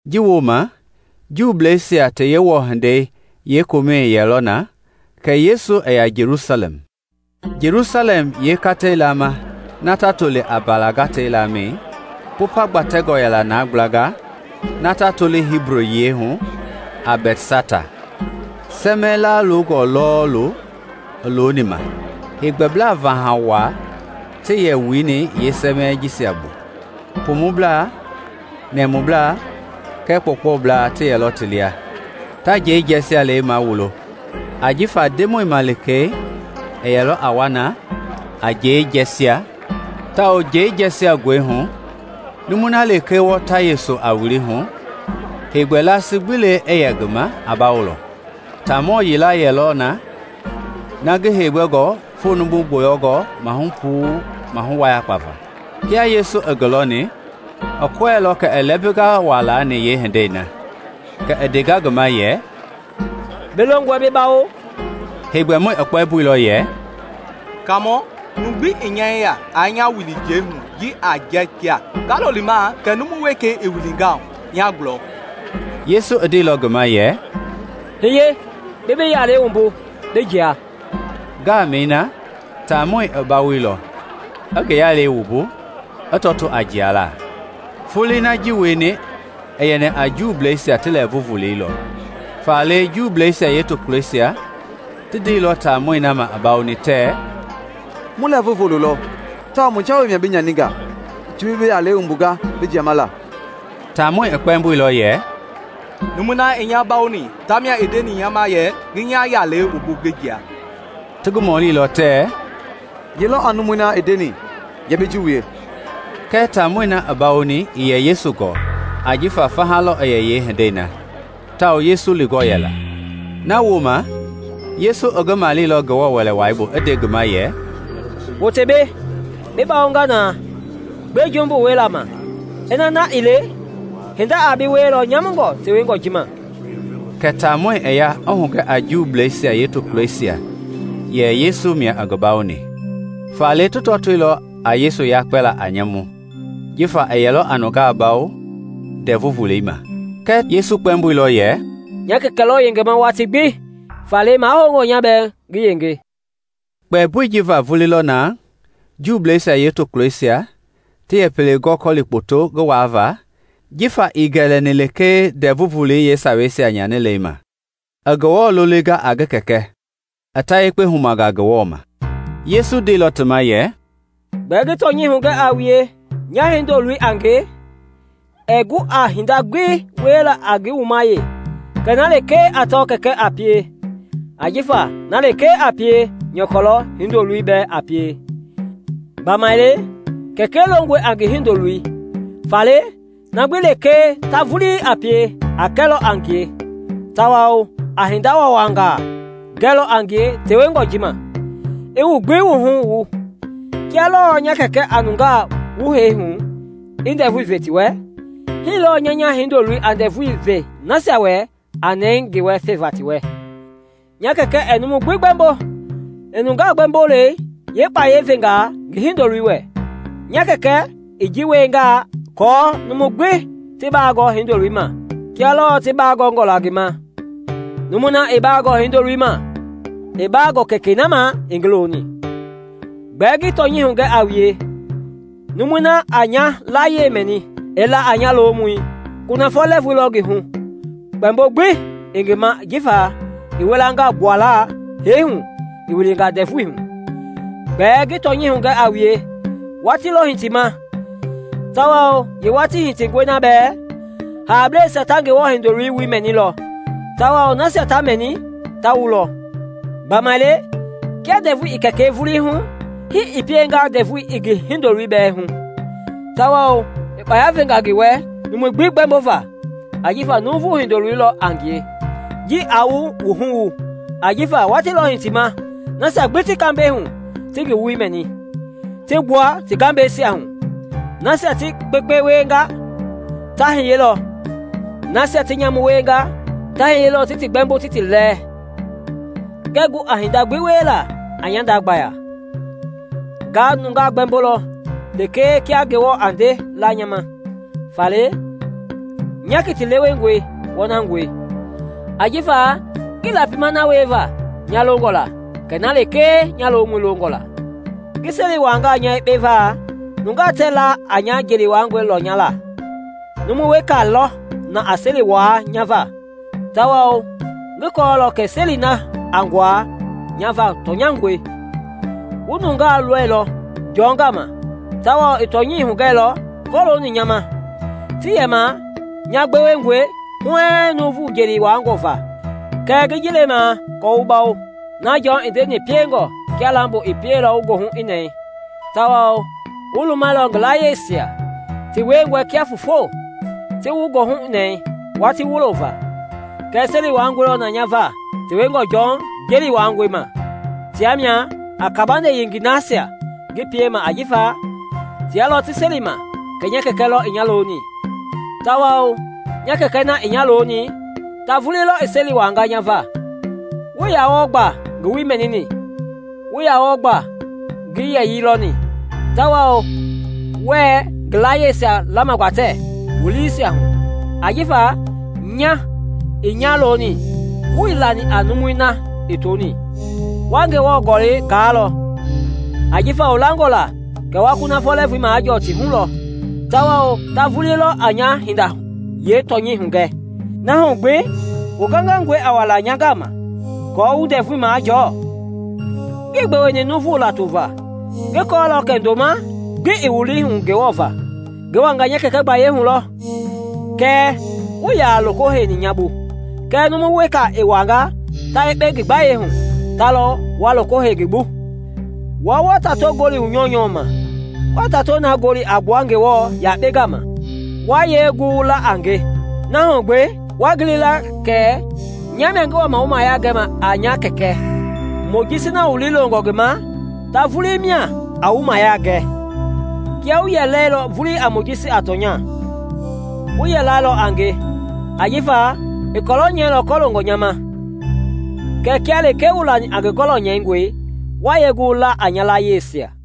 Ji wooma, Juuisia ti Yewɔ hindei yeekomɛ i yɛlɔ na kɛ Yesu i ya Jelusalɛm. Jelusalɛm yeekata-lamɛi na ta toli a Mbala Gata-Laamɛi, Popa gbatengɔ yɛlɔ na gblanga ta toli Hibu yiɛi hu a Bɛtsata, sɛmɛɛ laalongɔ lɔɔlu i looni ma. Heegbɛblaa vaha waa ti yɛlɔ wuni yeesɛmɛi jisia bu-- pumublaa, nɛmublaa kɛɛ kpɔɔkpɔblaa ti ti lia. [Ta njɛi jɛɛjialɛi mawulo. Ajifa Ndemɔi malikei i yɛlɔ na a njɛi jɛɛjia; tawao njɛi jɛɛjia ngɔi hu numui na lekee wɔɔta yese a wili hu, heegbɛ lasi gbi i yɛ ngi ma a bawolɔ.] Taamɔ yila yɛlɔ na, ngi heegbɛngɔ foo numu gbɔyɔngɔ maahu puu maahu wayakpa va. Kia Yesu ngi lɔni, i kɔɛilɔ kɛ i lɛmbinga waa laani yeehindei na, kɛ i ndenga ngi ma yɛ, “Bi longɔe bi bawo?” Heegbɛmɔi i kpɛmboilɔ yɛ, “Kaamɔ, numu gbi ii nya yeya aa nya wili njɛi hu ji a jɛɛjia; nga lo limaa kɛ numu wekei i wilinga hu nya gulɔ.” Yesu i ndeilɔ ngi ma yɛ, “Hiye, bi bi yalɛi wumbu, bi jia.” Ngaamɛi na, taamɔi i bawoilɔ, i ngi yalɛi wumbu, i tɔtoo a jialaa. Foloi na ji i wieni i yɛni a Juuisia ti lɛɛvu volei lɔ, faale Juuisia yeetokulɔisia ti ndeilɔ taamɔi na ma i bawoni tɛɛ, “Mu lɛɛvu volo lɔ tawao mu jawei mia bi nyaninga ji bi bi yalɛi wumbunga bi jiama la.” Taamɔi i kpɛɛmboilɔ yɛ, “Numui na i nya bawoni tamia i ndeni nya ma yɛ ngi nya yalɛi wumbu ngi jia.” Ti ngi mɔlilɔ tɛɛ, “Ye lɔ a numui na i ndeni yɛ bi ji wie?” Kɛɛ taamɔi na i bawoni ii yɛ Yesu gɔɔ ajifa faha lɔ i yɛ yeehindei na, tawao Yesu lingɔ yɛla. Na wooma Yesu i ngi maleilɔ Ngewɔ Wɛlei bu i nde ngi ma yɛ, “Wote mbei, bi bawonga na; gbe jumbu wielei ma, ina na ii le, hinda a bi wielɔ nyamungɔ tewengɔ ji ma.” Kɛ taamɔi i ya i hugɛ a Juuisia yeetokulɔisia yɛ Yesu mia i ngi bawoni. Faale ti tɔtoilɔ a Yesu yakpɛlaa a nyamu jifa i yɛlɔ a nungaa bawo Ndɛvu Volei ma. Kɛɛ Yesu i kpɛmboilɔ ti ma yɛ, “Nya Kɛkɛ lɔ yengema watii gbi faale mahoungɔ nya bɛɛ ngi yenge.” Kpɛmboi ji va vulii lɔ na Juuisia yeetokulɔisia ti yɛ pele gɔli kpɔtu ngi waava jifa ii gɛlɛni lekee Ndɛvu Volei yeesawei nyanila ma, i Ngewɔ lolinga a ngi Kɛkɛ, a ta yekpe huma Ngewɔ ma. Yesu ndeilɔ ti ma yɛ, “Gbɛɛ ngi tɔnyɛi hugɛ a wue, nya, Hindoloi a nge, ɛɛ gu a hinda gbi wiela a ngi wuma wee kɛ na lekee a tɔ Kɛkɛi a pie; ajifa na lekee a pie, nyɔkɔ lɔ Hindoloi bɛɛ a pie. Gbamaile Kɛkɛi longɔe a ngi Hindoloi faale na gbi lekee ta vulii a pie a kɛlɔ a ngie tawao a hinda waawangaa gɛlɔ a ngie tewengɔ ji ma, i wu gbi wuhu wu. Kia lɔɔ nya Kɛkɛ a nungaa wu hee hu i ndɛvui ve ti wɛ, hii lɔɔ nya nya Hindoloi a ndɛɛvui ve nasia wɛ a nɛɛ ngi wɛ feva ti wɛ. Nya Kɛkɛ ɛɛ numu gbi gbɛmbo; i nungaa gbɛmbolei yeekpayɛi venga ngi Hindoloi wɛ. Nya Kɛkɛ i ji wienga aako numui gbi ti baagɔɔ Hindoloi ma kia lɔɔ ti baa gɔngɔ la ngi ma. Numui na ii baagɔɔ Hindoloi ma, ii baagɔɔ Kɛkɛi na ma i ngi loni. “Gbɛɛ ngi tɔnyɛi hugɛ a wue, numui na a nya layie mɛni, i la a nya lomɔi, kunafɔ lɛɛvui lɔ ngi hu kpɛmbo gbi ii ngi ma jifa i wilanga gbuala hee hu i wilinga ndɛvui hu. Gbɛɛ ngi tɔnyɛi hugɛ a wue; watii lɔ hitima, tawao yeewatii hitingɔe na bɛɛ, haableisia ta Ngewɔ Hindoloi woi mɛnilɔ tawao nasia ta mɛni ta wulɔ. Gbamaile kia ndɛvui i Kɛkɛi vulii hu, hii i pienga ndɛvui i ngi Hindoloi bɛɛ hu, tawao i kpaya venga ngi wɛ numui gbi gbɛmbova, ajifa Nuuvu Hindoloi lɔ a ngie. Ji aa wu wuhu wu, ajifa watiilɔ hitima nasia gbi ti kambɛi hu ti ngi woi mɛni, ti gbua ti gambɛisia hu; nasia ti kpekpe wienga ta hiye lɔ, nasia ti nyamu wienga, ta hiyelɔ ti ti gbɛmbo ti ti lɛɛ. “Ngɛɛ gu a hinda gbi wiela a nya nda gbaya; nga nungaa gbɛmbolɔ lekee kia Ngewɔ a nde la nya ma, faale nya kiti lewengɔi wɔnangɔe, ajifa ngii lapima na wieva nya longɔ la, kɛ na lekee nya lomɔi longɔ la. “Ngi seli wuaangaa nya yekpe va, nungaa tɛɛ la a nya jeli wuaangɔi lɔnyala; numu weka lɔ na a seli wuaa nya va, tawao ngi kɔɔlɔ kɛ seli na a nguaa nya va tɔnyangɔe. Wu nungaa loilɔ Jɔn gama tawao i tɔnyɛi hugɛilɔ kɔlooni nya ma. Tii yɛma nya gbewengɔe huɛɛŋ nuuvu jeli wuaangɔ va; kɛɛ ngi ji lemaa aako wu bawo. Na Jɔn i ndeni piengɔ kia lambo, i pieilɔ wu goohu i nɛɛ tawao wu lumɛilɔ ngi layieisia, ti wiengɔ kia foofo, ti wu goohu nɛɛ watii wulo va. Kɛɛ seli wuaangɔ lɔ na nya va tewengɔ Jɔn jeli wuaangɔi ma; tia mia a kabande yengei nasia ngi piema ajifa tia lɔ ti selima kɛ nya Kɛkɛ lɔ i nya loni. Tawao nya Kɛkɛ na i nya loni, ta vuli lɔ i seli wuaanga nya va. Wuii yaa wɔɔ gba ngi woi mɛnini, wuii yaa wɔɔ gba ngi yɛyii lɔni; tawao wɛɛ ngi layieisia lamagbatɛ wu liisia hu, ajifa nya i nya loni wuii lani a numui na i toni. Wa Ngewɔ Gɔlɛi gaalɔ, ajifa wu langɔ la kɛ wa kunafɔ lɛɛvui majɔɔ ti hu lɔ; tawao ta vulii lɔ a nya hinda yeetɔnyɛi hugɛ; na hu gbi wu gangangɔe a wala nya gama aako wu ndɛvui majɔɔ. “Ngii gbeweni nuuvu lato va. Ngi kɔɔlɔ kɛ ndoma gbi ii wu lii hu Ngewɔ va. Ngi wanga nya Kɛkɛ gbayei hu lɔ kɛɛ wuii yaa loko heini nya bu; kɛɛ numu weka i wangaa ta yekpe ngi gbayei hu, ta lɔ wa loko hei ngi bu. Wua wa tato gɔli wu nyɔunyɔ ma, wɛɛ tatoi na gɔli a gbua Ngewɔ yakpei gama, wa yee gu wu la a nge? Na hu gbi, waa gili la kɛ nya mia ngi wama wu mayia gɛma a nya Kɛkɛ Mojisi na wu lii longɔ ngi ma, ta vulii mia a wu mayia gɛ. Kiaa wu yɛ lɛilɔ vulii a Mojisi a tɔnya, wu yɛ lalɔ a nge ajifa i kɔlɔ nyɛilɔ kɔloongɔ nya ma. Kɛɛ kia lekee wuii lani a ngi gɔlɔ nyɛingɔi, wa yee gu wu la a nya layieisia?”